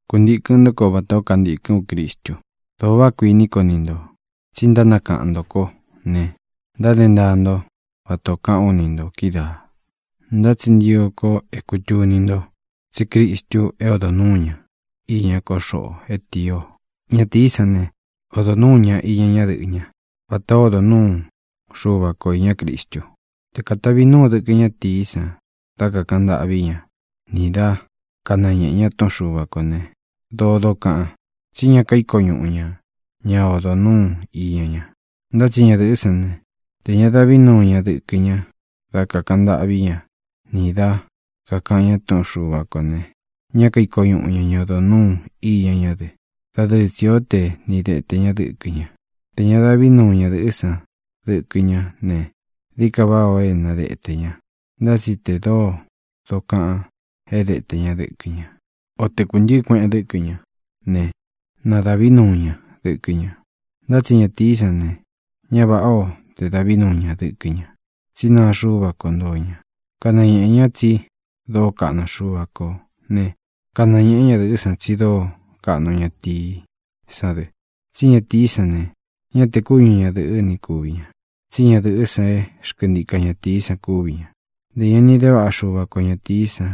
Kuntīkɨn ntó ko vatā ó kantīkɨ́n u Cristu. Dōo váꞌa kuiní ko ni ntō, tsí ntánakaꞌan ntō kó ne, ntáde ntaa nto vata ō kaꞌán u ni ntō kídaā. Ntá tsi ntio ko é kūtuni nto tsí Cristu é odo núu ña iña ko xoꞌo é tīí ō. Ñatīí san ne, odo nuū ñá iña ñadɨꞌɨ́ ña vatā ó odo nūú Xuva ko īñá Cristu. Te katāvi núu dɨkɨ ñátīí san dá kākaꞌan ntâꞌví ña nī dá kanañeꞌē ña túꞌun Xuva kō ne, dōo dokaꞌan, tsí ña kaíko ñuꞌu ña ña odo nūú iña ña. Ntá tsi ñadɨ̄ꞌɨ́ san ne, tē ña davi núu ña dɨkɨ ña dá kākaꞌan ntâꞌví ña nī dá kākaꞌan ña túꞌun Xuva kō ne, ñá kaiko ñuꞌu ña ña odo nūú iña ñá dɨ. Dadɨɨ tsī ó te ni dēte ña dɨ́kɨ ña. Tē ña dáꞌvi nuu ñadɨ̄ꞌɨ́ san dɨkɨ ñá ne, dií ka váꞌā ó é na detē ña. Ntá tsi tē dóo dokaꞌan é detē ñá dɨkɨ ñá, o te kūntɨɨ́ kueꞌen dɨ́kɨ ñá ne, na dāꞌví nuu ña dɨkɨ ña. Ntá tsi ñatīí san ne, ñá vāꞌá o te dāꞌví nuu ña dɨkɨ ña, tsí naa Xuva kó ntoo ña. Kanañēꞌe ñá tsi dóo kaꞌnu Xuva kō né, kanañēꞌe ñádɨ̄ꞌɨ́ san tsi dóo kaꞌnu ñatīí san dɨ. Tsí ñatīí san ne, ñá te kúñu ñadɨ̄ꞌɨ́ ni kūvi ña, tsí ñadɨ̄ꞌɨ́ san é xkɨntika ñatīí san kúvi ña. Ntē ña ni de váꞌa Xuva ko ñatīí san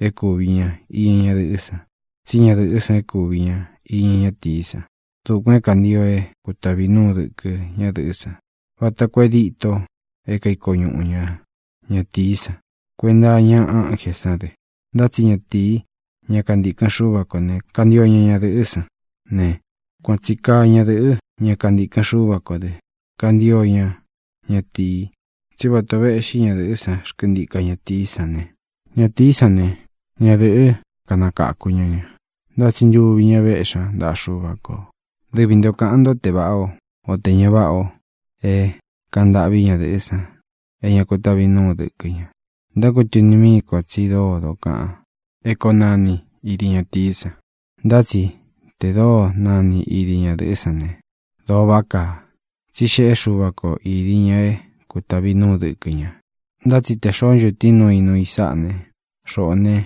é kūvi ña iña ñadɨꞌɨ́ san, tsí ñadɨ̄ꞌɨ́ san é kūvi ña iña ñatií san. Dukuān é kāntio é kutāvi núu dɨkɨ ñádɨ̄ꞌɨ́ san, vata koo é dito é kaiko ñuꞌu ña ñatīí san. Kuenta iña ánjē sán dɨ. Ntá tsi ñatīí, ña kantikɨn Xuva kō ne, kantio ña ñadɨ̄ꞌɨ́ san ne, kuan tsi kaa ñadɨ̄ꞌɨ́, ña kantikɨn Xuva kō dɨ́, kantio ña ñatīi. Tsí vata ō veꞌxí ñadɨ̄ꞌɨ́ san xkɨntika ñatīí san ne, ñatīí san ne, ñadɨ̄ꞌɨ́ kanakāku ña ña. Ntá tsi ntuvi ña véꞌxi ña ntaꞌa Xuva kō. Dɨvi ntō kaꞌan ntó te vāꞌá o, o tē ña váꞌa o é kāꞌan ntâꞌví ñadɨ̄ꞌɨ́ san é ña kutavi núu dɨkɨ ña. Ntákutuni míī kó tsi dóo dokaꞌan é koo nani idi ñatīí san. Ntá tsi tē dóo nani idi ñadɨ̄ꞌɨ́ san ne, dóo váꞌa kaa. Tsí xēꞌé Xuva ko idi ña é kutāvi núu dɨkɨ ña. Ntá tsi tē xoó ncho tiin núu i nuu i sáꞌa ne, xoꞌo ne,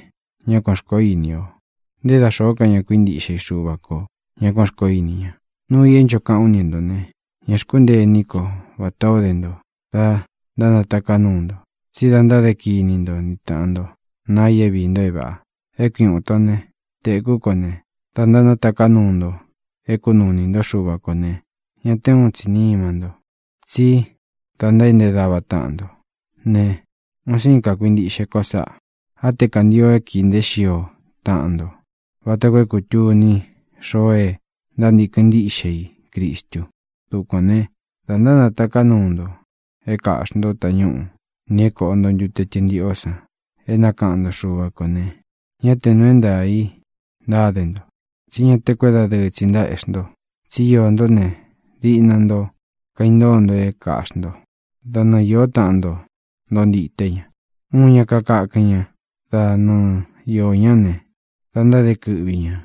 ñá kuān xkoó ini o; nté da xōó ka ña ntákuintiꞌxe i Xuva kō ñá kuān xkoó ini ña. Nuu i é ncho kaꞌán u ni ntō ne, ña xkúntee iní ko vatā ó de nto da ntánataká nuu nto, tsí da ntáde kini nto ni tāꞌan nto naa i é viī nto é vāꞌa. É kui uun itó ne, téku ko ne, da ntánataká nuu nto é kunuu inī ntó Xuva kō ne, ña té uun tsi nima nto, tsí da ntaéꞌnte dava táꞌan nto. Ne, un síin kakuintiꞌxe ko sáꞌa. Á te kāntio é kīi nteé xio taꞌan nto vata koo é kūtuni xoo é ntántīkɨn ntíꞌxe i Cristu. Dukuān ne, da ntánatāká nuu nto é kaꞌxī ntó tañúꞌu nī é kōꞌo nto ntute tɨntiꞌó san é nakaꞌan nto Xuva kō ne, ñá tē nuu é ntaā í ntáde nto. Tsí ña te kuédadɨɨ tsi ntaéꞌxi nto, tsí iō ntó ne, diꞌna nto kaintóo nto é kaꞌxi nto, da nɨɨ īó taꞌan nto ntoo ntite ña. Uun ña kakákɨn ña da nɨɨ iō ñá ne, da ntáde kɨꞌvi ñā.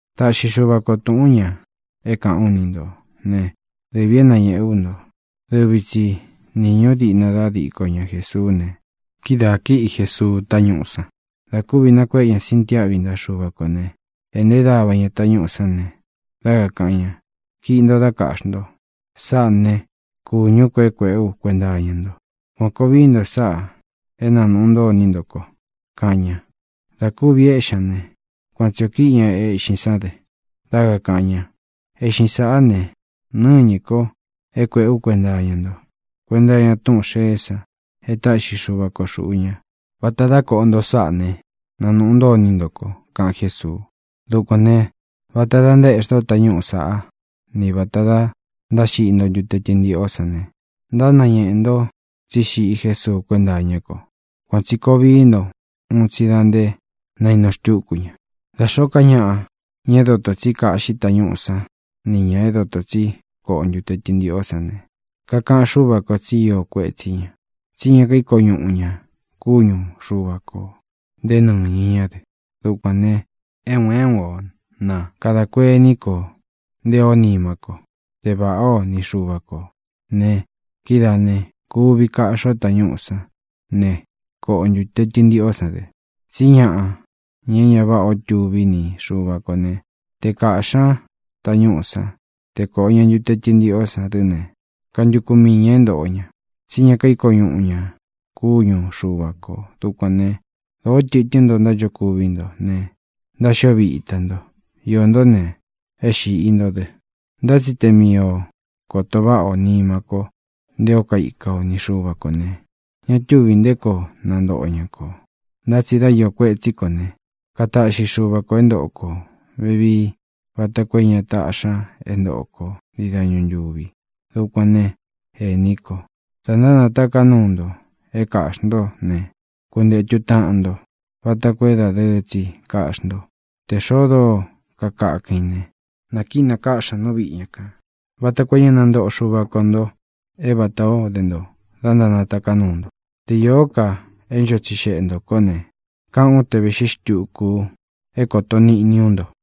Taꞌxi Xuva ko tūꞌún ña é kāꞌán u ni ntō ne, dɨvī é nañéꞌe ú nto: dɨvi tsi nīñú diꞌna dá diko ña Jésuú ne, kídaā kíꞌi Jesuu táñúꞌu san. Dā kúvi nakuéꞌe ña sintiáꞌvi ntaꞌa Xuva kō né, ēꞌnté dava ña tañúꞌū sán ne, dá kakāꞌan ña: “Kiꞌi nto, dá kāꞌxi nto. Sáꞌā ne, kúñū ko é kuēꞌé u kuenta iña nto. Kuān koo vií nto sáꞌā é nanūꞌu ntó iní nto ko”, kaꞌan ña. Dā kúvi éꞌxi ña ne, kuan tsi ō kíꞌi ña eꞌxín san dɨ́ ne, dá kakāꞌan ña: “Eꞌxin sáꞌa ne, nɨñɨ́ ko é kuēꞌé u kuenta iña nto, kuenta iña túꞌun xēé san e táꞌxi Xuva ko xūꞌu ña. Vata dá koꞌo nto sáꞌa ne, nanūꞌu ntó iní nto ko”, kaꞌan Jésuu. Dukuān ne, vata dá ntaéꞌxi ntó tañúꞌū saꞌá ni vāta dá ntáxiꞌi nto ntute tɨntiꞌó san ne, ntánañeꞌē nto tsí xiꞌi Jésuu kuénta iña ko. Kuān tsi koo vií nto un tsi da nté nainu xtúku ña. Da xōó ka ñaꞌa, ña é dotō tsi kaꞌxi tañúꞌū sán ni ñā é doto tsi koꞌo ntute tɨntiꞌó san ne, kakaꞌan Xúva kō tsi íō kuetsí ña, tsí ña kaíko ñuꞌu ña kúñu Xuva kō, nté nɨñɨ ñá dɨ. Dukuān ne, é un é un o na kadā kuení ko nté īó nima kó, te vāꞌá o ni Xuva kō ne, kidáā ne, kuvi kaꞌxi o tañúꞌū sán ne, koꞌo o ntūte tɨntiꞌó san dɨ. Tsí ñaꞌa, ña é ña váꞌā o tuvi ni Xuva kō ne, te kāꞌxi ñá tañúꞌū sán, te kōꞌo ña ntute tɨntiꞌó san dɨ́ ne, kantuku mii ñā é ntōꞌo ña, tsí ña kaíko ñuꞌu ña kúñu Xuva kō. Dukuān né, dōó tɨtɨ́n nto ntánchokuví nto ne, ntáxio vita nto. Iō ntó ne, e xíꞌi ntō dɨ. Ntá tsi te mii o kōto váꞌa o nimá kō nté o kaika ni Xuva kō ne, ña túvī nté koo nantoꞌo ña kō. Ntá tsi dá īo kuétsi ko ne, kataꞌxi Xuva ko é ntoꞌo kō vevii vata koo é ña taꞌxi ña é ntoꞌo ko ntii dañu ntūvi. Dukuān né, ēní ko, dá ntánataká nuu nto é kāꞌxi ntó ne, kuntētu táꞌan nto vata koo é dādɨɨ tsi kaꞌxí nto. Tē xoo dóo kakakɨn i ne, nā kínakáꞌxi ña nú viꞌi ña kān, vata koo é ña nantoꞌo Xuva ko nto é vatā ó de nto da ntánataká nuu nto. Te īó ka é ncho tsixeꞌe ntō kó ne, kaꞌán u te vēꞌxí xtuku ú é koto niꞌni ú nto.